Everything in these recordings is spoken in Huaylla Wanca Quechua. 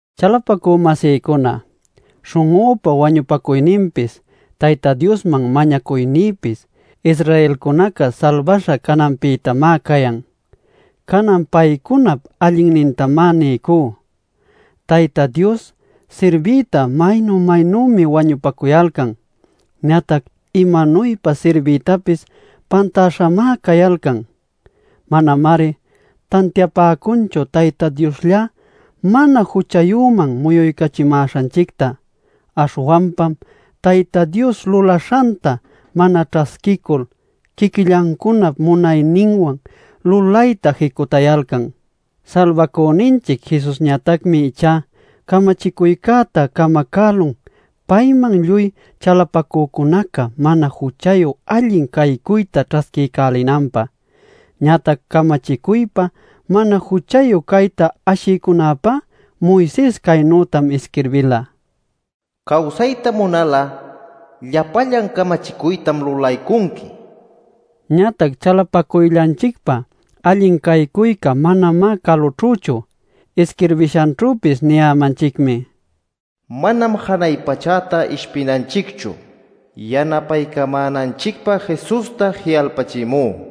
Chalapacü-masïcuna, śhun'üpa wañupacuyninpis Tayta Diosman mañacuynïpis Israelcunaca salbaśha cananpïtamá cayan. Canan paycunap allinnintam niycú: Tayta Diosta sirbiyta maynu-maynümi wañupacuyalcan. Ñatac imanuypa sirbiytapis pantaśhamá cayalcan. Manamari tantiapäcunchu Tayta Dioslla mana juchayüman muyuycachimäśhanchicta. Aśhwanpam Tayta Dios lulaśhanta mana ćhasquicul quiquillancunap munayninwan lulayta jicutayalcan. Salbacüninchic Jesusñatacmi ichá camachicuycäta camacälun payman lluy chalapacücunaca mana juchayu allin caycuyta ćhasquiycälinanpä. Ñatac camachicuypa mana juchayu cayta ashïcunäpá Moises caynütam isquirbila: “Cawsayta munal'a llapallan camachicuytam lulaycunqui” nil. Ñatac chalapacuyllanchicpa allin caycuyca manamá calućhüchu. Isquirbishanćhüpis niyämanchicmi: “Manam janay pachäta ishpinanchicchu (yanapaycamänanchicpä Jesusta ji'alpachimü)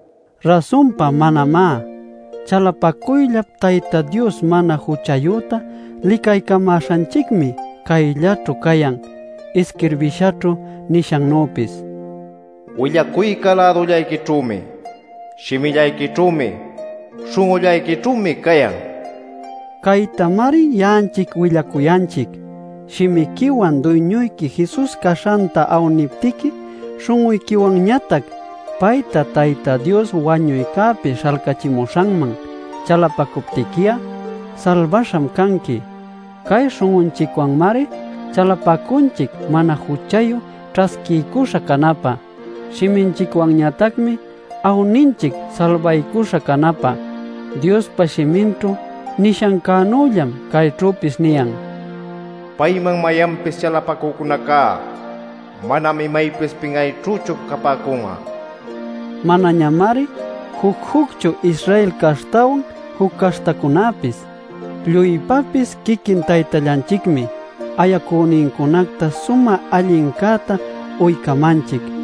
Rasunpa manamá. Chalapacuyllap Tayta Dios mana juchayüta licaycamäśhanchicmi cayllaćhu cayan isquirbishaćhu nishannüpis: “Willacuyca lädullayquićhümi; shimillayquićhümi, śhun'ullayquićhümi cayan” nil. Caytamari ya'anchic willacuyanchic: Shimiquiwan Duyñuyqui Jesus caśhanta awniptiqui, śhun'uyquiwanñatac payta Tayta Dios wañuycäpi śhalcachimuśhanman chalapacuptiqui'a, salbaśham canqui. Cay śhun'unchicwanmari chalapacunchic mana juchayu ćhasquiycuśha canapä; shiminchicwanñatacmi awninchic salbaycuśha canapä. Diospa shiminćhu nishancänüllam cayćhüpis niyan: “Payman mayanpis chalapacücunacá manam imaypis pin'ayćhüchu capäcun'a” nil. Manañamari juc-jucchu Israel caśhtawan juc caśhtacunäpis; lluypäpis quiquin Taytallanchicmi ayacünincunacta sumä allincäta uycamanchic.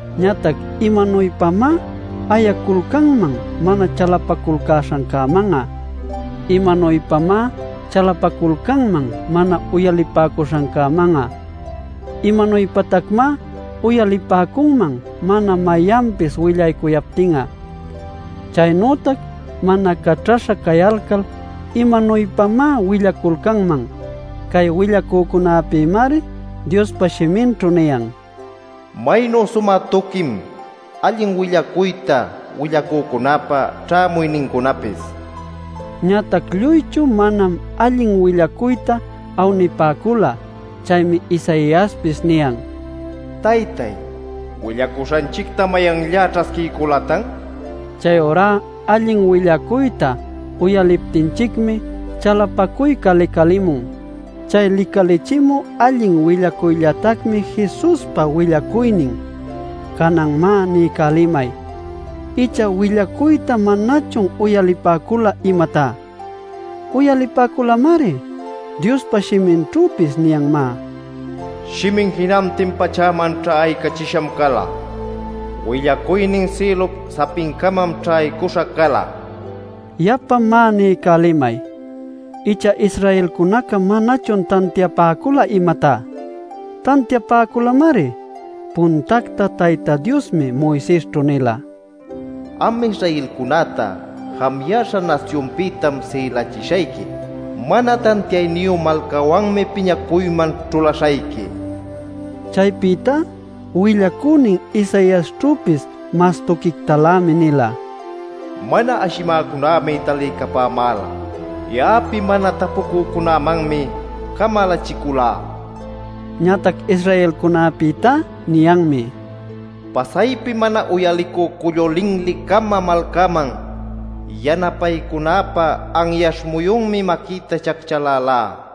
Ñatac ¿imanuypamá ayaculcanman mana chalapaculcäśhancäman'a? ¿Imanuypamá chalapaculcanman mana uyalipäcuśhancäman'a? ¿Imanuypatacmá uyalipäcunman mana mayanpis willaycuyaptin'a? Chaynütac mana caćhaśha cayalcal ¿imanuypamá willaculcanman? Cay willacücunäpïmari Diospa shiminćhu niyan: “¡Maynu sumä tuquim allin willacuyta willacücunäpa ćhämuynincunapis!” nil. Ñatac lluychu manam allin willacuyta awnipäcula. Chaymi Isaiaspis niyan: “Taytay ¿willacuśhanchicta mayanllá ćhasquiyculatan?” nil. Chayurá allin willacuyta uyaliptinchicmi chalapacuyca licalimun. Chay licalichimü allin willacuyllatacmi Jesuspa willacuynin. Canan má, niycälimay: ¿Icha willacuyta manachun uyalipäcula, imatá? ¡Uyalipäculamari! Diospa shiminćhüpis niyanmá: “Shimin jinantin pachäman ćhaycächisham cala. ¡Willacuynin sïlup sapincamam ćhaycuśha cala!” nil. Yapa má, niycälimay: ¿Icha Israelcunaca manachun tantiapäcula, imatá? ¡Tantiapäculamari! Puntactá Tayta Diosmi Moisesćhu nila: “Am Israelcunäta jamuyäśha nasyunpïtam sïlachishayqui. Mana tantiayniyu malcawanmi piñacuyman ćhulaśhayqui” nil. Chaypïtá willacünin Isaiasćhüpis mas tuquictalämi nila: “Mana ashimäcunämi taliycapämäla. Ya'api mana tapucücunämanmi camalachiculá” nil. Ñatac Israelcunapïtá niyanmi: “Pasaypi mana uyalicü cullu-linli-cama malcaman yanapaycunäpä anyaśh muyunmi maquïta chacchalalá” nil.